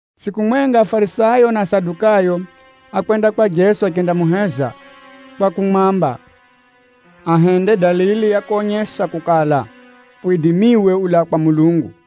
Tsʼiku mwenga, Afarisayo na Asadukayo ákwenda kwa Jeso achendamuheza kwa kumwamba ahende dalili ya konyesa kukala, widimiwe ulaa kwa Mulungu.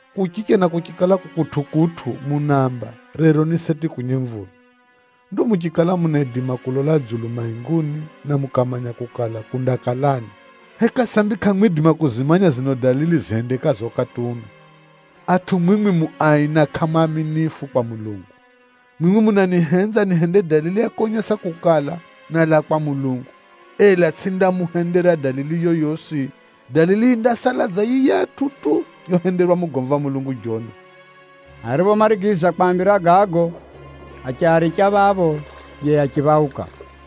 Kuchicha na kuchikala ku kutʼukutʼu, munaamba, ‘Rero ni seti kunye mvula!’ Ndo muchikala munaidima kulola dzulu mainguni na mukamanya kukala kundakalani, heka sambi kʼamwidima kuzimanya zino dalili zihendekazo ukati uno? Atʼu mwimwi mu ai na kʼamu aaminifu kwa Mulungu! Mwimwi munanihenza nihende dalili ya konyesa kukala, nálaa kwa Mulungu, ela tsʼindamuhendera dalili yoyosi. Dalili yindasala dza yiyatʼu tu yohenderwa mugomvi wa Mulungu Jona.” Ariphomarigiza kwaambira gago, achiaricha phapho yiye achiphauka.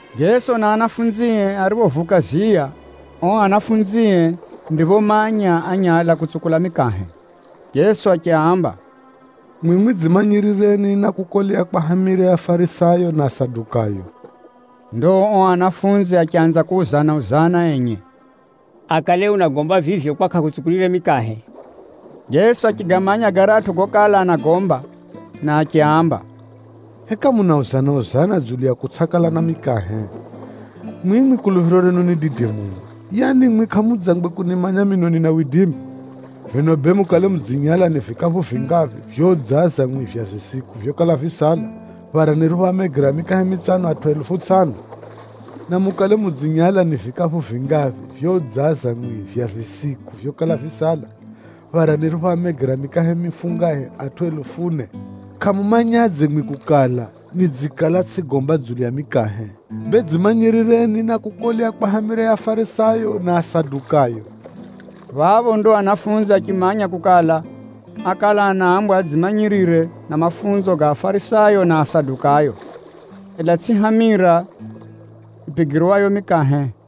Jeso na anafunzie ariphovuka ziya, ao anafunzie ndiphomanya ányala kutsukula mikahe. Jeso achiaamba, “Mwimwi dzimanyirireni na kukolea kwa hamira ya Afarisayo, na Asadukayo!” Ndo ao anafunzi achanza kuuzana-uzana enye kwa enye, “Akale unagomba vivyo kwa kʼahutsukulire mikahe?” Jeso achigamanya garatʼu gokala anagomba na achiaamba, “Heka munauzana-uzana dzulu ya kutsʼakala na mikahe? Mwimwi kuluphiro renu ni dide muno! Yaani mwimwi kʼamudzangwe kunimanya mino nina widimi? Vino bee mukale mudzinyala ni vikaphu vingaphi vyoudzaza mwimwi vya visiku vyokala visala, phara niriphoamegera mikahe mitsano atʼu helufu tsʼano? Na mukale mudzinyala ni vikaphu vingaphi vyoudzaza mwimwi vya visiku vyokala visala, phara niriphoamegera mikahe mifungahe atʼu helufu ne? Kʼamumanyadze mwimwi kukala, nidzikala tsʼigomba dzulu ya mikahe? Bee dzimanyirireni na kukolea kwa hamira ya Afarisayo na Asadukayo!” Phapho ndo anafunzi achimanya kukala, ákala anaambwa adzimanyirire na mafunzo ga Afarisayo na Asadukayo, ela tsʼi hamira yipigirwayo mikahe.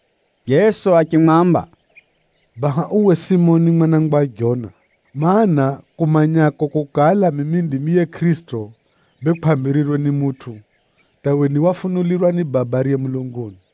Jeso achimwamba, “Baha uwe Simoni mwana wa Jona! Maana, kumanyako kukala mimi ndimi yiye Kʼirisito, bee kwʼambirirwe ni mutʼu, hata uwe ni wafunulirwa ni Baba ariye mulunguni.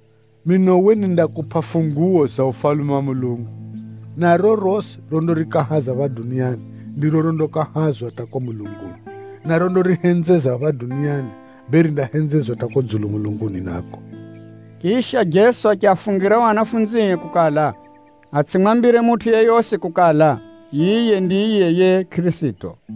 Mino uwe nindakupʼa funguwo za Ufalume wa Mulungu, na rorosi rondarikahaza phapha duniani, ndiro rondakahazwa hata kuko mulunguni, na rondarihenzeza phapha duniani, bee rindahenzezwa hata kuko dzulu mulunguni nako.” Chisha, Jeso achiafungira ao anafunzie kukala atsʼimwambire mutʼu yeyosi kukala, yiye ndiye yiye Kʼirisito.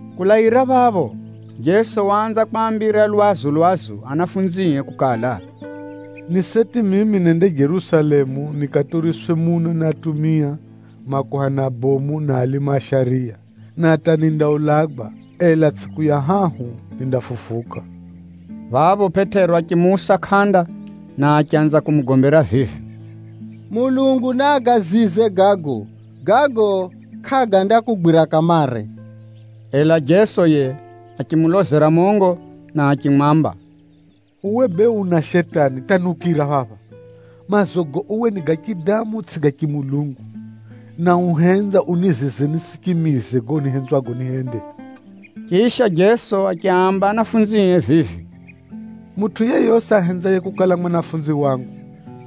Kulaira phapho, Jeso waanza kwaambira lwazu-lwazu anafunzie kukala, “Ni seti mimi nende Jerusalemu nikaturiswe muno ni atumia, makuhani abomu na alimu a shariya. Na hata nindaulagwa, ela tsʼiku ya hahu nindafufuka.” Phapho Pʼetero achimuusa kʼanda, na achanza kumugombera vivi, “Mulungu naagazize gago! Gago kʼagandakugwira kamare!” Ela Jeso yiye achimulozera mongo Pʼetero na achimwamba, “Uwe bee una Shetani hata niukira phapha! Maazogo uwe ni ga chidamu tsʼigo ga chimulungu, na uhenza unizize nitsʼichimize gago nihenzwago nihende.” Chisha, Jeso achiaamba anafunzie vivi, “Mutʼu yeyosi ahenzaye kukala mwanafunzi wangu,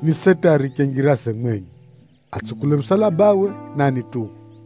ni seti ariche njiraze mwenye, atsukule musalabawe, na anituwe.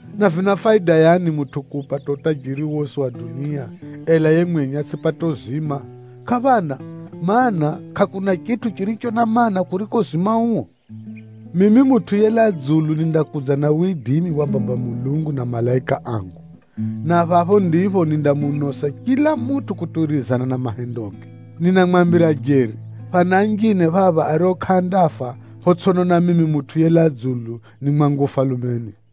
Na vina faida yani mutʼu kuupata utajiri wosi wa dunia, ela yiye mwenye atsʼipate uzima? Kʼaphana! Maana, kʼakuna chitʼu chiricho na maana, kuriko uzima uo. Mimi Mutʼu yelaa dzulu nindakudza na widimi wa Baba Mulungu na malaika angu, na phapho ndipho nindamunosa chila mutʼu kutuwirizana na mahendoge. Ninamwambira jeri, phana anjine phapha ario kʼaandafa photsʼinona mimi Mutʼu yelaa dzulu ni mwangu Ufalumeni.”